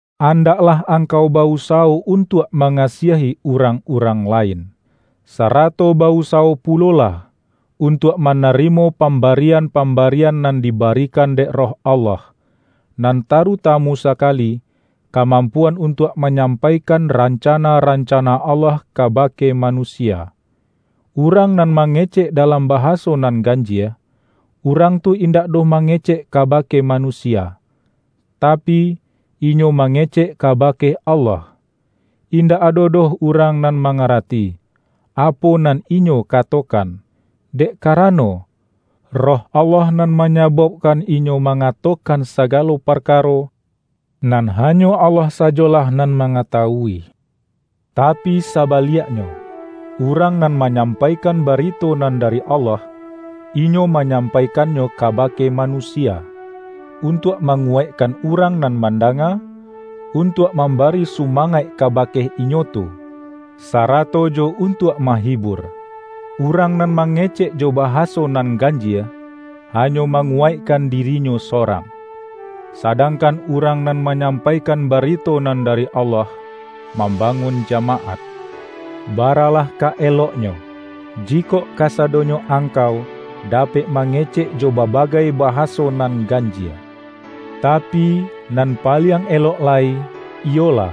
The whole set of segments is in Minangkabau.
Andaklah angkau ba-usawo un-tuak mangasiahi urang-urang lain. Sarato ba-usawo pulolah, untuak manarimo pambarian-pambarian nan dibarikan dek Roh Allah, nan taruta-mu sakali, kamampuan untuak ma-nyampaikan rancana-rancana Allah kabake manusia. Urang nan mange-cek dalam bahaso nan ganjie, urang tu indak doh mangecek kabake ma-nusia; tapi, inyo mangecek kabake Allah. Indak ado doh urang nan ma-ngarati, apo nan inyo katokan, dek karano, Roh Allah nan manyabaukkan inyo mangatokan sagalo parkaro, nan hanyo Allah sajolah nan manga-tawui. Tapi sabaliaknyo, urang nan manyampaikan barito nan dari Allah, inyo manyampaikannyo kabake ma-nusia; untuak manguwaikkan urang nan mandanga, untuak mambari su-mangaik kabake inyo tu, sarato jo un-tuak mahibur. Urang nan mangecek jo bahaso nan ganjie, hanyo mangu-waikkan dirinyo sorang, sadangkan urang nan manyampaikan barito nan dari Allah, mambangun jamaat. Baralah ka eloknyo, jikok kasado-nyo angkau dapek mangecek jo ba-bagai bahaso nan ganjie. Tapi, nan paliang elok lai, iyolah,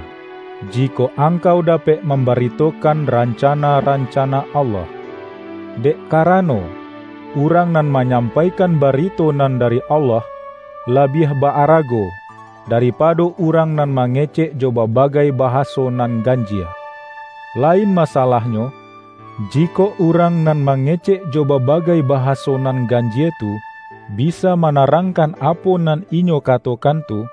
jikok angkau dapek mambaritokan rancana-ranca-na Allah. Dek karano, urang nan ma-nyampaikan barito nan dari Allah, labiah ba-arago, daripado urang nan mangecek jo babagai bahaso nan gan-jie; lain masalahnyo, jikok urang nan mangecek jo babagai bahaso nan gan-jie tu, bisa manarangkan apo nan inyo katokan tu,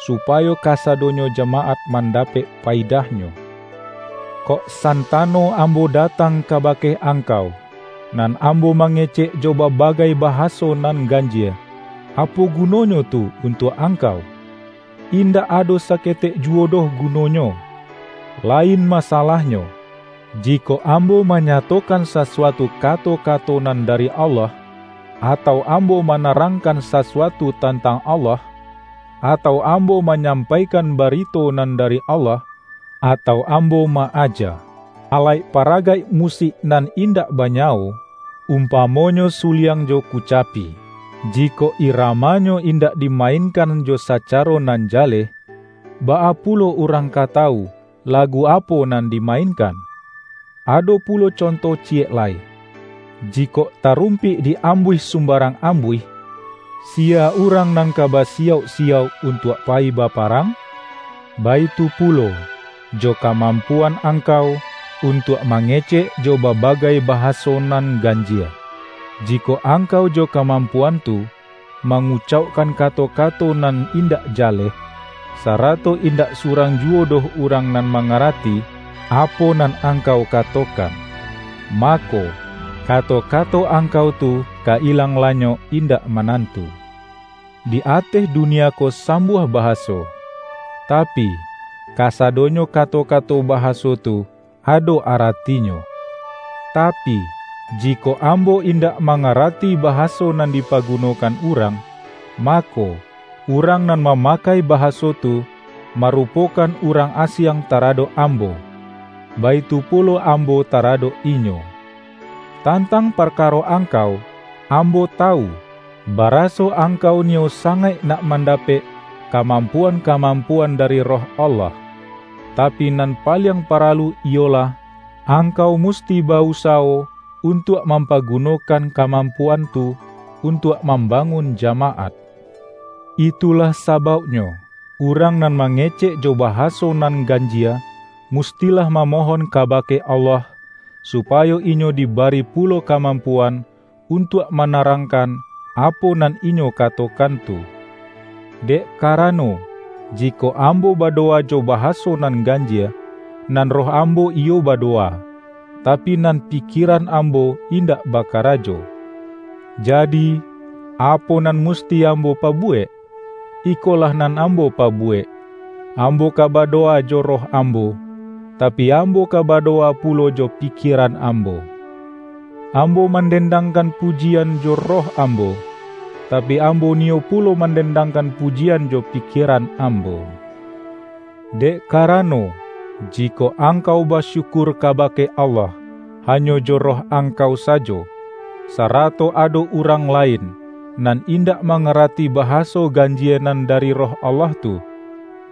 supayo kasadonyo jamaat mandapek payidahnyo. Kok santano ambo datang kabake angkau, nan am-bo mangecek jo babagai bahaso nan ganjie, apo gunonyo tu untuak ang-kau? Indak ado saketek juwo doh gu-nonyo! Lain masalahnyo, jikok ambo manyatokan sasuatu kato-kato nan da-ri Allah, atau ambo manarangkan sa-suatu tantang Allah, atau ambo ma-nyampaikan barito nan dari Allah, atau ambo ma-aja. Alaik paragaik musik nan indak ba-nyawo, umpamonyo suliang jo kuca-pi, jikok iramanyo indak dimainkan jo sacaro nan jaleh, baa pulo urang ka tawu, lagu apo nan dimainkan? Ado pulo conto ciyek lai: Jikok ta-rumpik di-ambuih sumbarang ambuih, siya urang nan ka basiyauk-siyauk un-tuak payi baparang? Baitu pulo, jo kamampuan angkau, untuak mange-cek jo babagai bahaso nan ganjie. Ji-kok angkau jo kamampuan tu, mangu-caukkan kato-kato nan indak jaleh, sarato indak surang juwo doh urang nan mangarati, apo nan angkau ka-tokan. Mako, kato-kato angkau tu ka ilang lanyok indak manantu. Di ateh dunia ko sambuah bahaso, tapi, kasa-donyo kato-kato bahaso tu, ado arati-nyo. Tapi, jikok ambo indak manga-rati bahaso nan dipagunokan urang, mako, urang nan mamakai bahaso tu, marupokan urang asiang taradok ambo; baitu pulo ambo taradok inyo. Tantang parkaro angkau, ambo ta-wu, baraso angkau niyo sangaik nak mandapek kamampuan-kamampuan dari Roh Allah. Tapi nan paliang para-lu iyolah, angkau musti ba-usawo un-tuak mampagunokan kamampuan tu, untuak mambangun jamaat. Itulah sabauknyo, urang nan ma-ngecek jo bahaso nan ganjie, mustilah mamohon kabake Allah, supayo inyo dibari pulo kamampuan untuak ma-narangkan, apo nan inyo katokan tu. Dek karano, jikok ambo badowa jo bahaso nan ganjie, nan roh ambo iyo badowa, tapi nan pikieran ambo in-dak bakarajo. Jadi, apo nan musti ambo pabuwek? Ikolah nan ambo pa-buwek: Ambo ka badowa jo roh am-bo, tapi, ambo ka badowa pulo jo pi-kieran ambo. Ambo mandendangkan pujian jo roh ambo, tapi, ambo niyo pulo mandendangkan pujian jo pikie-ran ambo. Dek karano, jikok ang-kau basyukur kabake Allah, hanyo jo roh angkau sajo, sarato ado urang la-in, nan indak mangarati bahaso gan-jie nan dari Roh Allah tu,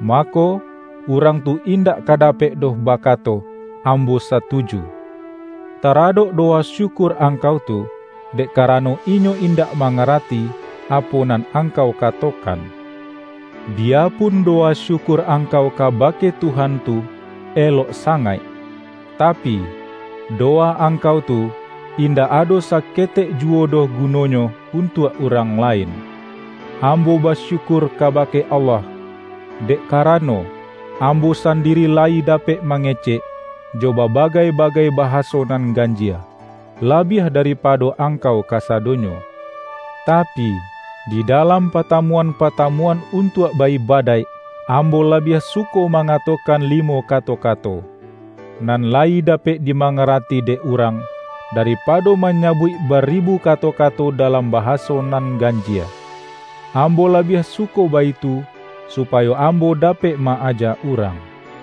mako, urang tu indak ka dapek doh bakato,”Ambo satuju", taradok dowa syukur angkau tu; dek karano inyo indak mangarati, apo nan angkau katokan. Biyapun dowa syukur angkau kabake Tuhan tu, elok sangaik, tapi, dowa angkau tu, indak ado saketek juwo doh gu-nonyo untuak urang lain. Ambo basyukur kabake Allah, dek karano, ambo sandiri layi dapek ma-ngecek, jo babagai-bagai bahaso nan ganjie, labiah daripado angkau kasadonyo. Tapi, di dalam patamuan-patamuan untuak ba-ibadaik, ambo labiah suko mangatokan limo kato-kato, nan layi dapek dimangarati dek urang, daripado manyabuik baribu kato-kato dalam bahaso nan ganjie. Ambo labiah suko baitu, supayo am-bo dapek ma-aja urang.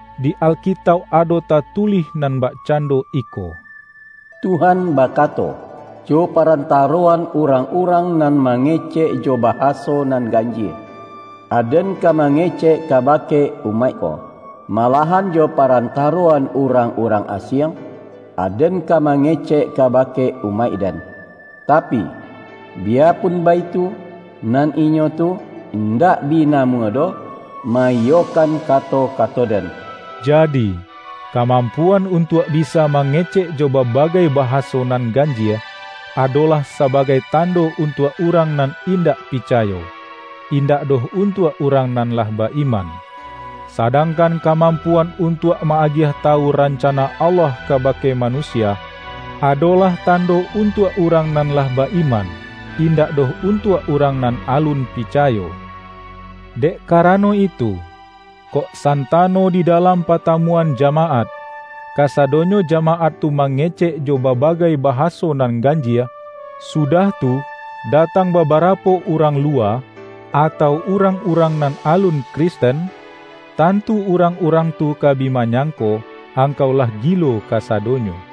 Di Alkitauk ado tatulih nan bakcando iko,”Tuhan bakato, ’Jo parantaroan urang-urang, nan mangecek jo bahaso nan ganjie, Aden ka mangecek kabake umaik ko. Malahan jo parantaroan urang-urang asiang, Aden ka mangecek kabake umaik-Den; tapi, biyapun baitu, nan inyo tu indak bi namuah doh ma-iyokan kato-kato Den.’” Jadi, kamampuan untuak bisa ma-ngecek jo babagai bahaso nan ganjie, adolah sabagai tando untuak urang nan indak picayo, indak doh untuak urang nan lah ba-iman. Sadangkan kamampuan untuak ma-agiah tawu rancana Allah kabake manusia, adolah tando untuak urang nan lah ba-iman, indak doh untuak urang nan alun pi-cayo. Dek karano itu, kok santano di dalam patamuan jamaat, kasadonyo jamaat tu mangecek jo babagai bahaso nan ganjie, sudah tu, datang babarapo urang luwa, atau urang-urang nan alun Kristen, tantu urang-urang tu ka bi manyangko, angkau lah gilo kasado-nyo!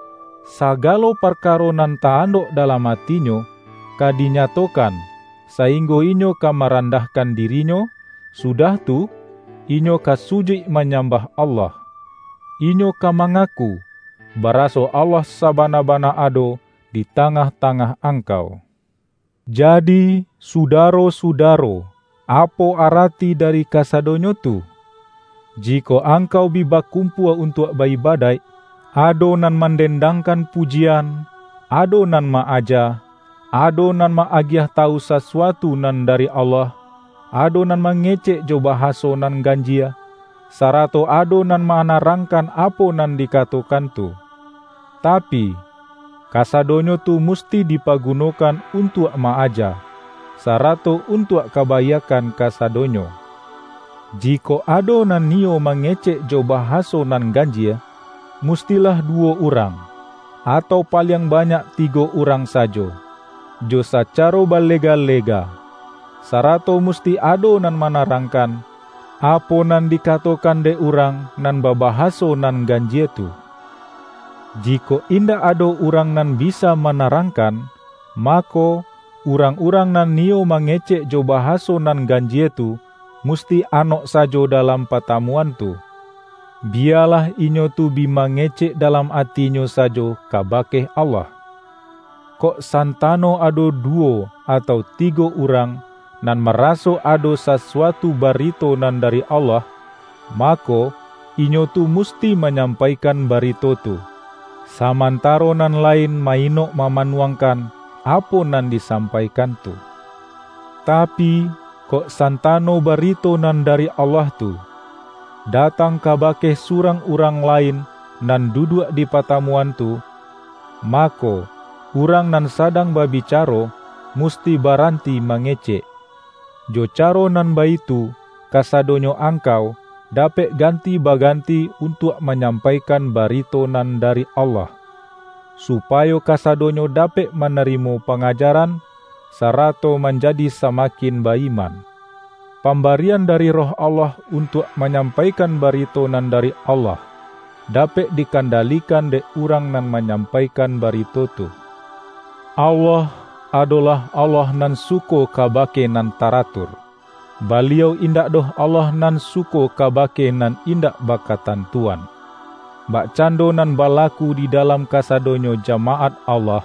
Sagalo parkaro nan ta-andok dalam atinyo, ka dinyatokan, sainggo inyo ka marandahkan dirinyo, sudah tu, inyo ka sujuik manyambah Allah. Inyo ka mangaku, baraso Allah sabana-bana ado di tangah-tangah angkau. Jadi, sudaro-sudaro, apo arati da-ri kasadonyo tu? Jikok angkau bi ba-kumpua untuak ba-ibadaik, ado nan mandendangkan pujian, ado nan ma-aja, ado nan ma-agiah tawu sasuatu nan dari Allah, ado nan mangecek jo bahaso nan ganjie, sarato ado nan ma-narangkan apo nan dikatokan tu. Ta-pi, kasadonyo tu musti dipagunokan untuak ma-aja, sarato untuak kaba-iakkan kasadonyo. Jikok ado nan niyo mangecek jo bahaso nan ganjie, mustilah duwo urang, atau paliang ba-nyak tigo urang sajo, jo sacaro bale-ga-lega. Sarato musti ado nan mana-rangkan, apo nan dikatokan dek urang nan babahaso nan ganjie tu. Jikok indak ado urang nan bisa manarang-kan, mako, urang-urang nan niyo ma-ngecek jo bahaso nan ganjie tu, musti anok sajo dalam patamuan tu. Biyalah inyo tu bi mangecek dalam atinyo sajo kabake Allah. Kok santano ado du-wo atau tigo urang, nan maraso ado sasuatu barito nan dari Allah, mako, inyo tu musti manyampaikan barito tu, samantaro nan lain ma-inok ma-manuangkan, apo nan disampaikan tu. Tapi, kok santano barito nan dari Allah tu, datang kabake surang urang lain nan duduak di patamuan tu, ma-ko, urang nan sadang babicaro, mus-ti baranti mangecek. Jo caro nan baitu, kasadonyo angkau, dapek ganti baganti untuak manyampaikan bari-to nan dari Allah; supayo kasadonyo dapek manarimo pangajaran, sarato manjadi samakin ba-iman. Pamba-rian dari Roh Allah untuak manyam-paikan barito nan dari Allah, dapek dikandalikan dek urang nan manyampaikan barito tu. Allah, adolah Allah nan suko kabake nan taratur; Baliau indak doh Allah nan suko kabake nan indak bakatantuan. Bakcando nan balaku di dalam ka-sadonyo jamaat Allah,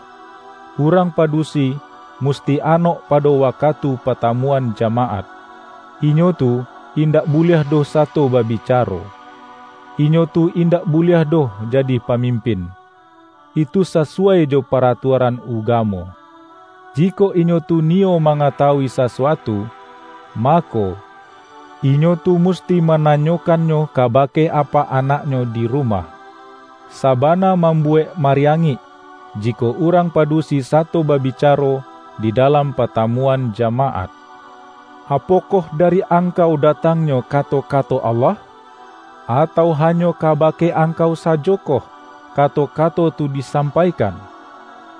urang padu-si musti anok pado wakatu patamuan jamaat. Inyo tu indak buliah doh sato babicaro. Inyo tu indak buliah doh ja-di pamimpin; itu sasuwai jo paratua-ran ugamo. Jikok inyo tu niyo ma-ngatawui sasuatu, mako, inyo tu musti mananyokannyo kabake apak anaknyo di rumah. Sabana mambuwek mari-angik, jikok urang padusi sato babica-ro di dalam patamuan jamaat. Apokoh dari angkau datangnyo kato-kato Allah? Atau hanyo kabake angkau sajokoh, kato-kato tu disam-paikan?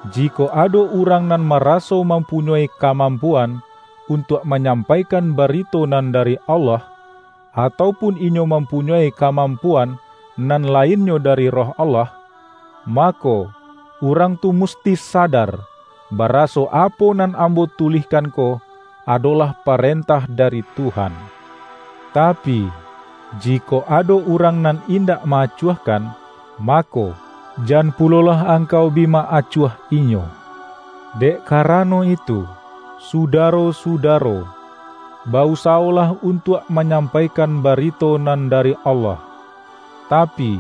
Jikok ado urang nan ma-raso mampunyoi kamampuan, untuak manyampaikan barito nan dari Allah, atau pun inyo mampunyoi kamampu-an nan lainnyo dari Roh Allah, mako, urang tu musti sadar, baraso apo nan ambo tulihkan ko, adolah parentah da-ri Tuhan. Tapi, jikok ado urang nan indak ma-acuahkan, mako, jan pulo-lah angkau bi ma-acuahkan inyo. Dek karano itu, sudaro-sudaro, ba-usawolah untuak manyampaikan barito nan dari Allah, tapi,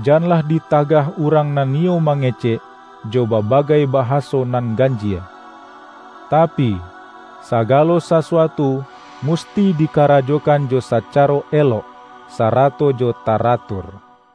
janlah di-tagah urang nan niyo mangecek, jo babagai bahaso nan ganjie. Tapi, sagalo sasuatu musti dikarajokan jo sacaro elok, sarato jo taratur.